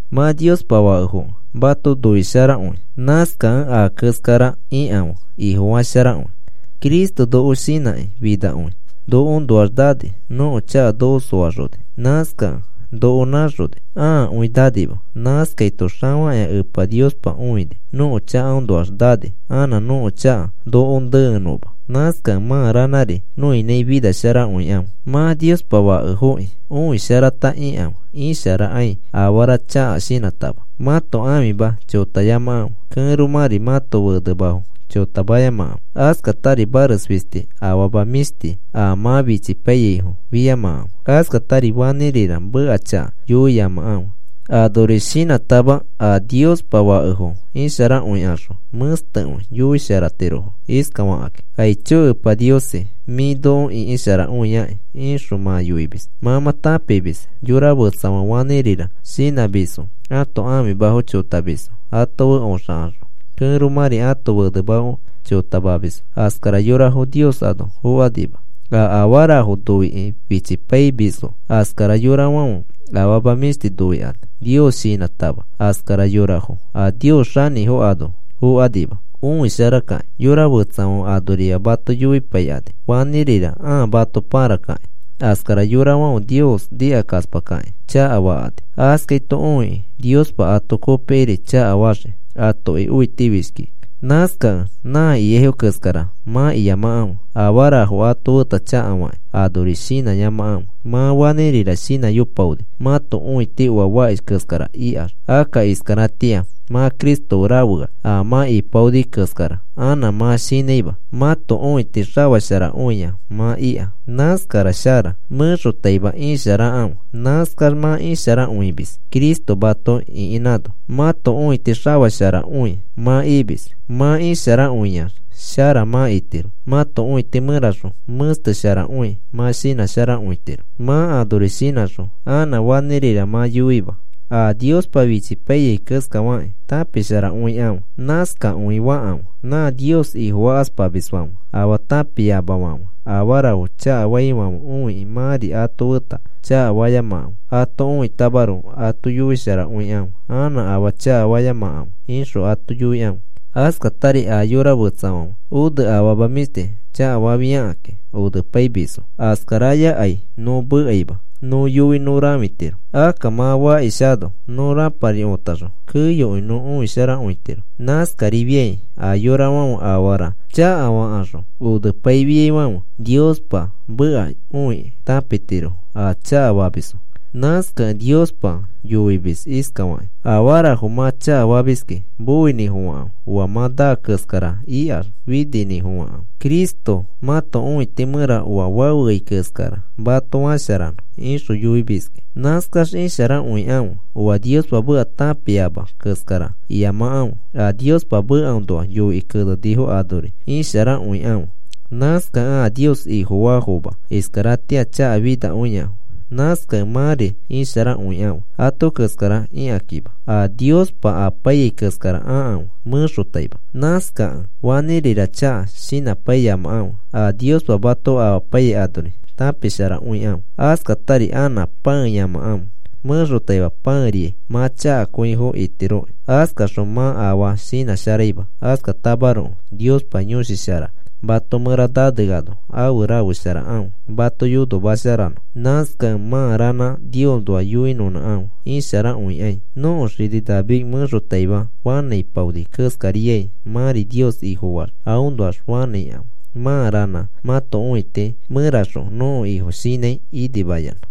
Mã Niospa fakefokẽ mato noisharakõi. Nãskakẽ a keskara ikãfe, Ifofasharakõi. Cristo noko shinãkĩ finakõi nokoõnoax nani. Nõko chaka noko soaxoni. Nãskakẽ noko nãxoni, aakõi nanima. Nãskaito xafakĩa Epa Niospa õini nõko chakaõnoax nani, anã nõko chaka nokoõ neenõma. Nãskakẽ mã ranãri nõinãi finasharakõikãfe. Mã Niospa fakefokĩ õisharata ikãfe. Isharakãi afarafo chaka shinãtama. Mãto ãfimafo chotayamakãfe. Kẽromãri mãto fenemafo chotamayamakãfe. Askatari mares fisti afama mĩshti a mã fichipaiyaifo fiyamakãfe. Askatari fanĩrira meka chaka yoiyamakãfe. Anori shinãtama a Niospa fakefo isharakõikaxõ, mẽstekõi yoisharatirofo iskafakĩ: “Aicho Epa Niosi, mĩ noko ĩkisharakõiaki,” ixõ mã yoimis. Mã mã tãpimis yora fetsafãfe fanĩrira shinãmisfo ãto ãfimafo chotamisfo ato fe oxakaxõ, kẽromãri ãto fenemafo chotamamisfo, askara yorafo Nios ano fokanima. A afarafo noikakĩ fichipaimisfo, askara yorafãfe afama mĩshtifo noikani Nios shinãtama, askara yorafo a Nios xanĩfo ano fokanima. Õisharakakĩ yora fetsafãfe anorima mato yoipaikani fanĩrira ãa mato pãrakakĩ. Askara yorafãfe Nios nikakaspakakĩ chakafakani. Askaito õikĩ Niospa ato kopikiri chakafaxii atoki õitifishkikĩ. Nãskakẽ nã ikaifo keskara mã iyamakãfe. Afarafo ato feta chakafakĩ, anori shinãyamakãfe. Mã fanĩrira shinãyopaoni mãto õiti oa fakish keskara ikax, akka iskaratĩa mã Cristo fe rafeax a mã iyopaoni keskara anã mã shinãima. Mãto õiti xafasharakõia mã ika. Nãskara shara. Mẽxotaima isharakãfe. Nãskax mã isharakõimis. Cristo mato ĩkinãno mãto õiti xafasharakõi mã imis. Mã isharakõiax shara mã itiro. Mãto õiti mẽraxõ mẽstesharakõi mã shinãkõitiro. Mã anori shinãxõ anã fanĩrira mã yoima. A Niospa fichipaiyai keskafakĩ tãpisharakõikãfe. Nãskakõi fakãfe. Nã Nios Ifofakaspamisfãfe, afaa tãpiamafãfe afarafo chakafaifãfe õiki mãri ato feta chakafayamakãfe. Ato õitamaroko ato yoisharakõikãfe: “Anã afaa chakafayamakãfe,” ixõ ato yoikãfe. Askatari a yora fetsafãfe one afama mĩshti chakafafiakĩ onepaimisfo. Askarayakai nõ mekaima nõ yoi nõ rãfitiro. Akka mã fakishano nõ rãpari otaxõ, keyokõi nõ õisharakõitiro. Nãskarifiai a yorafãfe afarafo chakafakaxõ onepaifiaifãfe, Niospa meka õikĩ tãpitirofo a chakafamisfo. Nãskakẽ Niospa yoimis iskafakĩ: Afarafo mã chakafamiski moinĩfofãkãfe oa mã naa keskara ikax fininĩfofãkãfe Cristo mãto õiti mẽra oa fafeai keskara mato fasharanõ, ixõ yoimiski. Nãskax isharakõikãfe. Oa Niospa meka tãpiama keskara iyamakãfe. A Niospa mekaõnoa yoikĩ kenenifo anori isharakõikãfe. Nãskakẽ a Nios Ifofaafomafo iskaratĩa chakafinakõiafo. Nãskakẽ mãri isharakõikãfe ato keskara ikakĩma. A Niospa apaiyai keskara akãfe mẽxotaima. Nãskakẽ fanĩrira chaka shinãpaiyamakãfe a Niospa mato amapaiyai anori tãpisharakõikãfe. Askatari anã pãeyamakãfe. Mẽxotaima pãeriai mã chakakõifo itiroki. Askaxõ mã afaa shinãsharaima. Askatamaroko Niospa Yõshi Shara mato mẽra naneano afe rafesharakãfe mato yonomasharanõ. Nãskakẽ mã ranã Niosnoa yoinõnãkãfe isharakõikai. Nõko xini David mẽxotaima fanãipaoni keskariai mãri Nios Ifofaax aõnoax fanãikãfe mã ranã mãto õiti mẽraxõ nõko Ifo shinãi inimayanã.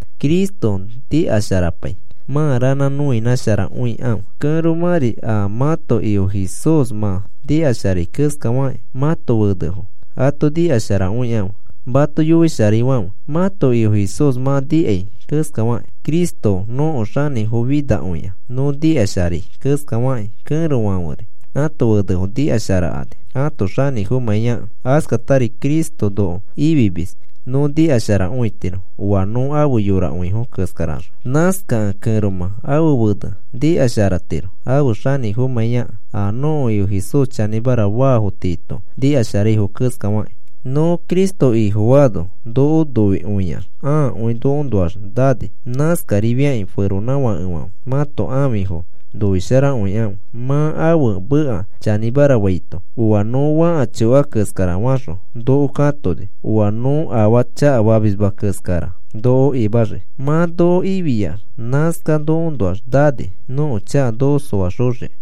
Cristo nikasharapai, mã ranã nikanõnãsharakõikãfe. Kẽromãri a mãto Ifo Jesús mã nikasharai keskafakĩ, mãto fenefo ato nikasharakõikãfe mato yoisharaifãfe, mãto Ifo Jesús mã nikai keskafakĩ. Cristo nõko xanĩfofinakõia nõ nikasharai keskafakĩ, kẽrofãferi ãto fenefo nikasharakani ãto xanĩfomãiyakẽ. Askatari Cristo noko ifimis nõ nikasharakõitiro oa nõ afe yorakõifo keskaraxõ. Nãskakẽ kẽromã ãfe fene nikasharatiro ãfe xanĩfomãiyakẽ a nõko Ifo Jesús chanĩmara faafo tiito nikasharaifo keskafakĩ. Nõ Cristo Ifofaano noko noikõiax aakõi nokoõnoax nani. Nãskarifakĩ feronãfakefãfe, mãto ãfifo noisharakõikãfe. Mã ãfe meka chanĩmara faito, oa noko fãka choka keskara faxõ noko katoni, oa nõ afaa chakafamisma keskara noko imaxii. Mã noko ifiax, nãskax nokoõnoax nani nõko chaka noko soaxoxiki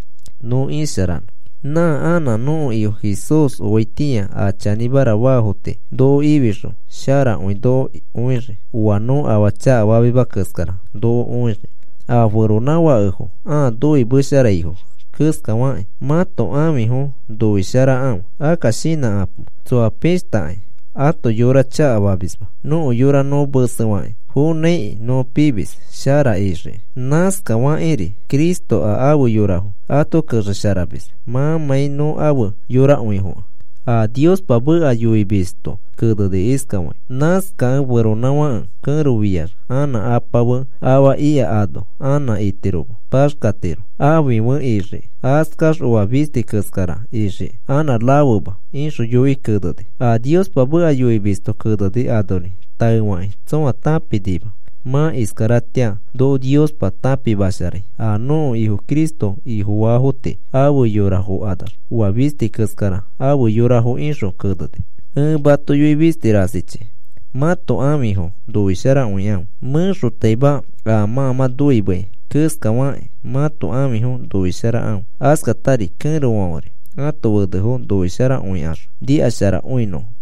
nõ isharanõ. Nã anã nõko Ifo Jesús oaitĩa a chanĩmara faafo tii noko ifixõ sharakõi noko õixii, oa nõ afaa chakafamisma keskara noko õixii. A feronãfakefo ãa noimesharaifo keskafakĩ, mãto ãfifo noisharakãfe. Akka shinãkapo. Tsõa pishtakai ato yora chakafamisma. Nõko yora nõ mesefakĩ fonãikĩ nõ pimis shara nixiki. Nãskafakĩri Cristo a afe yorafo ato kexesharamis mãmãi nõ afe yorakõifokẽ. A Niospa meka yoimisto keneni iskafakĩ: “Nãskakẽ feronãfãke kẽro fiax anã apa fe afa ikano anã ano itiroma. Paxkatiro, ãfi fe ixiki. Askax oa fisti keskara ixiki anã rafema,” ixõ yoikĩ keneni. A Niospa meka yoimisto keneni anori taefakĩ tsõa tãpinima. Mã iskaratĩa noko Niospa tãpimasharai a nõko Ifo Cristo Ifofaafo tii afe yorafokanax, oa fisti keskara afe yorafo ixõ keneni. Ẽ mato yoi fisti rasichi mãto ãfifo noisharakõikãfe. Mẽxotaima aa mã mã noimeai keskafakĩ mãto ãfifo noisharakãfe. Askatari kẽrofãferi ãto fenefo noisharakõikaxõ nikasharakõinõfo.